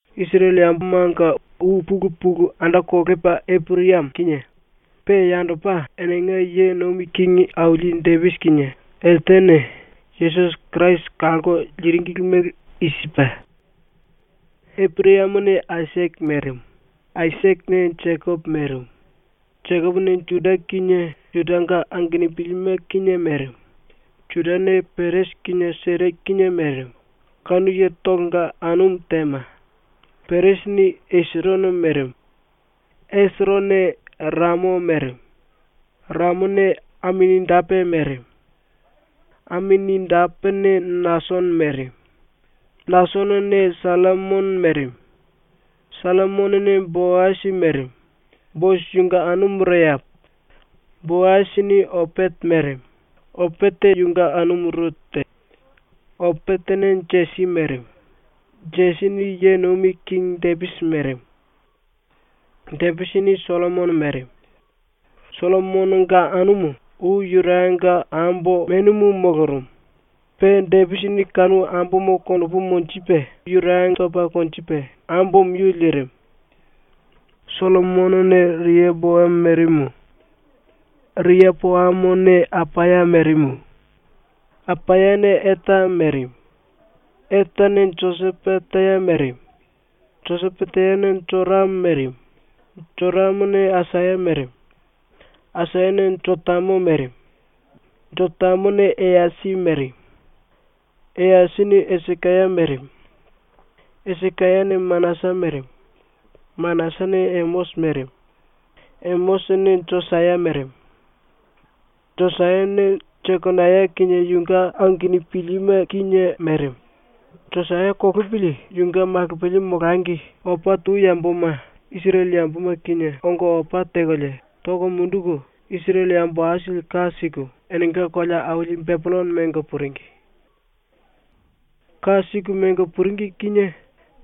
⸤Isirele yambomanga ou pulu pulu anda kolepa⸥ Eporayamo kinie pe yandopa ⸤enenga ye nomi kingi aili⸥ Depisi kinie eltene Yesusi Kirasi kalko liringili mele i sipe: Eporayamone Aisake merimu; Aisakene Jekopo merimu; Jekopone Juda kinie Judanga angenupilime kinie merimu; Judane Peresi kinie Sera kinie merimu, kanu yetolonga anumu Tema; Peresini Esirono merimu; Esironone Ramo merimu; Ramone Aminadape merimu; Aminadapene Nasono merimu; Nasonone Sallimono merimu; Sallimonone Boasi merimu, Boasi yunge anumu Reapa; Boasini Opete merimu, Opete yunge anumu Rute; Opetene Jesi merimu; Jesini ye nomi kingi Depisi merimu. Depisini Sollomono merimu. Sollomononga anumu ou Yurayanga ambo menumu molorumu. Pe Depisini kanu ambomo konopu monjipe Yuraya topa konjipe ambomo yu lirimu. Sollomonone Riapoamo merimu; Riapoamone Apaya merimu; Apayane Eta merimu; Etane Josipate merimu; Josipatene Joramo merimu; Joramone Asaya merimu; Asayane Jotamo merimu; Jotamone Eyasi merimu; Eyasini Esikaya merimu; Esikayane Manasa merimu; Manasane Emosi merimu; Emosini Josaya merimu; Josayane Jekonaya kinie yunge angenupilime kinie merimu. Josaya kolopili yunge malopili molangi opa tou yamboma Isirele yamboma kinie ongo opa tekolie toko munduku Isirele yambo aisili ka siku enenga kolea aili Bepillono mengo puringi. Ka siku mengo puringi kinie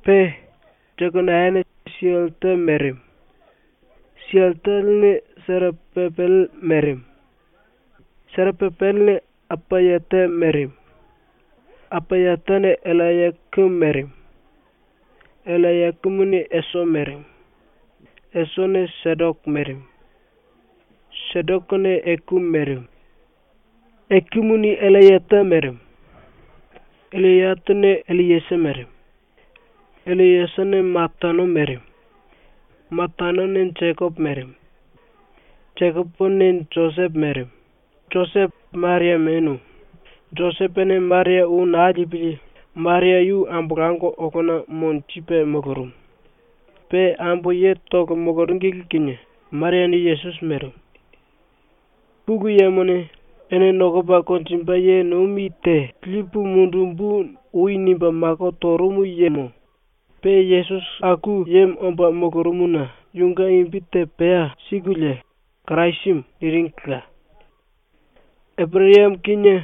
pe Jekonayane Sialtele merimu; Sialtelene Serapapele merimu; Serapapelene Apayate merimu; Apayatene Ellayakimu merimu; Ellayakimuni Eso merimu; Esone Sedoke merimu; Sedokene Ekimu merimu; Ekimuni Ellayate merimu; Ellayatene Elliesa merimu; Elliesane Matano merimu; Matanone Jekopo merimu; Jekopone Josepo merimu. Josepo Maria menu. Josepone Maria ou naa lipili Maria yu ambolango olona monjipe molorumu. Pe ambo yetolo moloringili kinie Mariane Yesusi merimu. ⸤Pulu Yemone “Ene nokopa konjimbe ye nomi te lipu mundumbu.” ou nimbe mako torumu yemo pe Yesusi aku yemo omba molorumuna⸥ yunge imbi te pea sikulie ‘Kirasimu’ niringila. Eporayamo kinie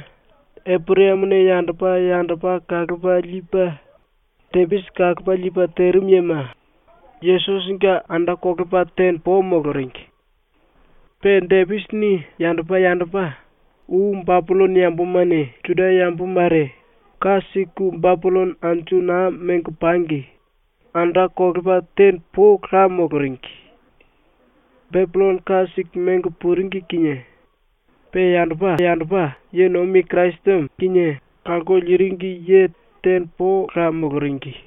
Eporayamone yandopa yandopa kalopa lipe Depisi kalopa lipe terimu yema ⸤Yesusinge⸥ anda kolepa tene po moloringi. Pe Depisini yandopa yandopa ou Bepillono yambomane Juda yambo mare ka siku Bepillono anju naa mengo pangi anda kolepa tene pola moloringi. Bepillono ka siku mengo puringi kinie pe yandopa ye nomi Kirasimu kinie kalko liringi ye tene pola moloringi.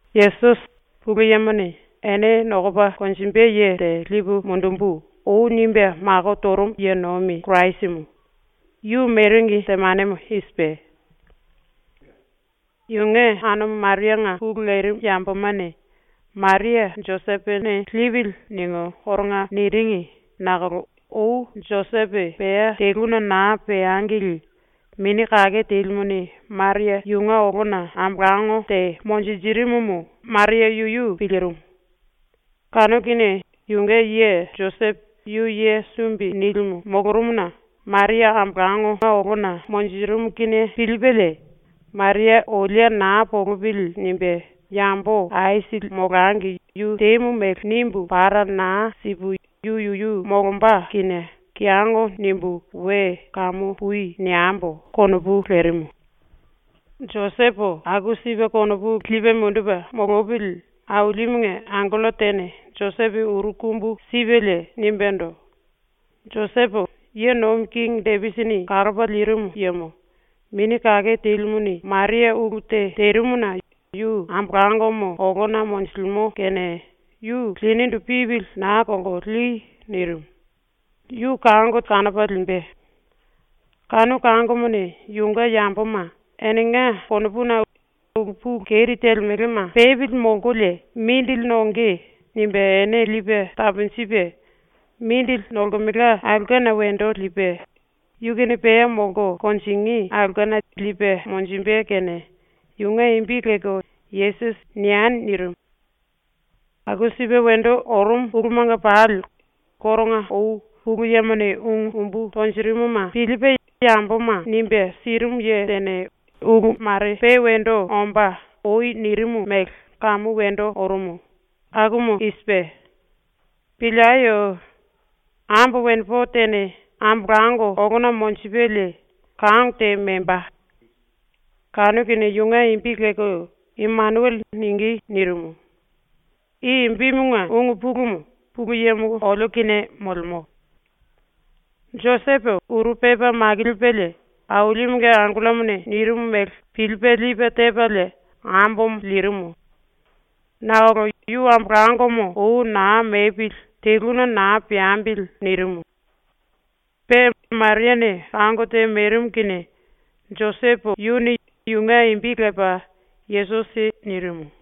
Yesusi, Pulu Yemone “Ene nokopa konjimbe ye te lipu mundumbu.” ou nimbe mako torumu ye nomi Kirasimu, yu meringi temanemo i sipe: Yunge anumu Marianga pulu lerimu yambomane “Maria Josepone lipili.” ningu koronga niringi nakolo ou Josepo pea teluna naa peangili Mini Kake Telimuni Maria yunge olona ambolango te monjinjirimumu Maria yuyu pilirimu. Kanu kinie yunge ye Josepo yu ye sumbi nilimu molorumuna Maria ambolango monjirimu kinie pilipelie ‘Maria olie naa polopili.’ nimbe ‘Yambo aisili molangi yu temu mele nimbu para naa sipu yu yuyu molomba kinie kiyongo nimbu we “Kamu pui.” niembo.’ konopu lerimu. Josepo aku sipe konopu lipe mundupe molopili Ailimunge angello tene Josepo uru kumbu sipelie nimbendo: “Josepo, ye nomi kingi Depisini kalopa lirimu yemo, Mini Kake Telimuni Maria ulu te terimuna yu ambolangomo olana monjilimo kene yu linindu pipili naa kolko li.” nirimu. “Yu kango kanopa limbe. Kanu kangomone yunge yamboma ‘Enenga konopuna ulu pulu keri telemelema pepili molkolie mindili nonge.’ nimbe ene lipe taponjipe, mindili nolemelka ulkena wendo lipe, yu kinie pea molko konjingí aulkena lipe monjimbe kene yunge imbi lelko “Yesusi” nieni.” nirimu. Aku sipe wendo orumu ulumanga pali koronga ou Pulu Yemone ungu umbu tonjirimuma pilipe yamboma nimbe sirimu ye tene ulu mare pe wendo ombá ou nirimu mele kamu wendo orumu. Akumu i sipe: “Pilieyo. Ambo wenepo tene ambolango olona monjipelie kango te memba. Kanu kinie yunge imbi lelko “Imenuele” ningí.” nirimu. I imbimunge ungu pulumu ‘Pulu Yemo olio kinie molemo’. Josepo uru pepa makilipelie Ailimunge angellomone nirimu mele pilipe lipe tepalie ambomo lirimu. Nakolo yu ambolangomo ou naa mepili “Teluna naa peambili.” nirimu. Pe Mariane kango te merimu kinie Josepo yuni yunge imbi lepa “Yesusi” nirimu.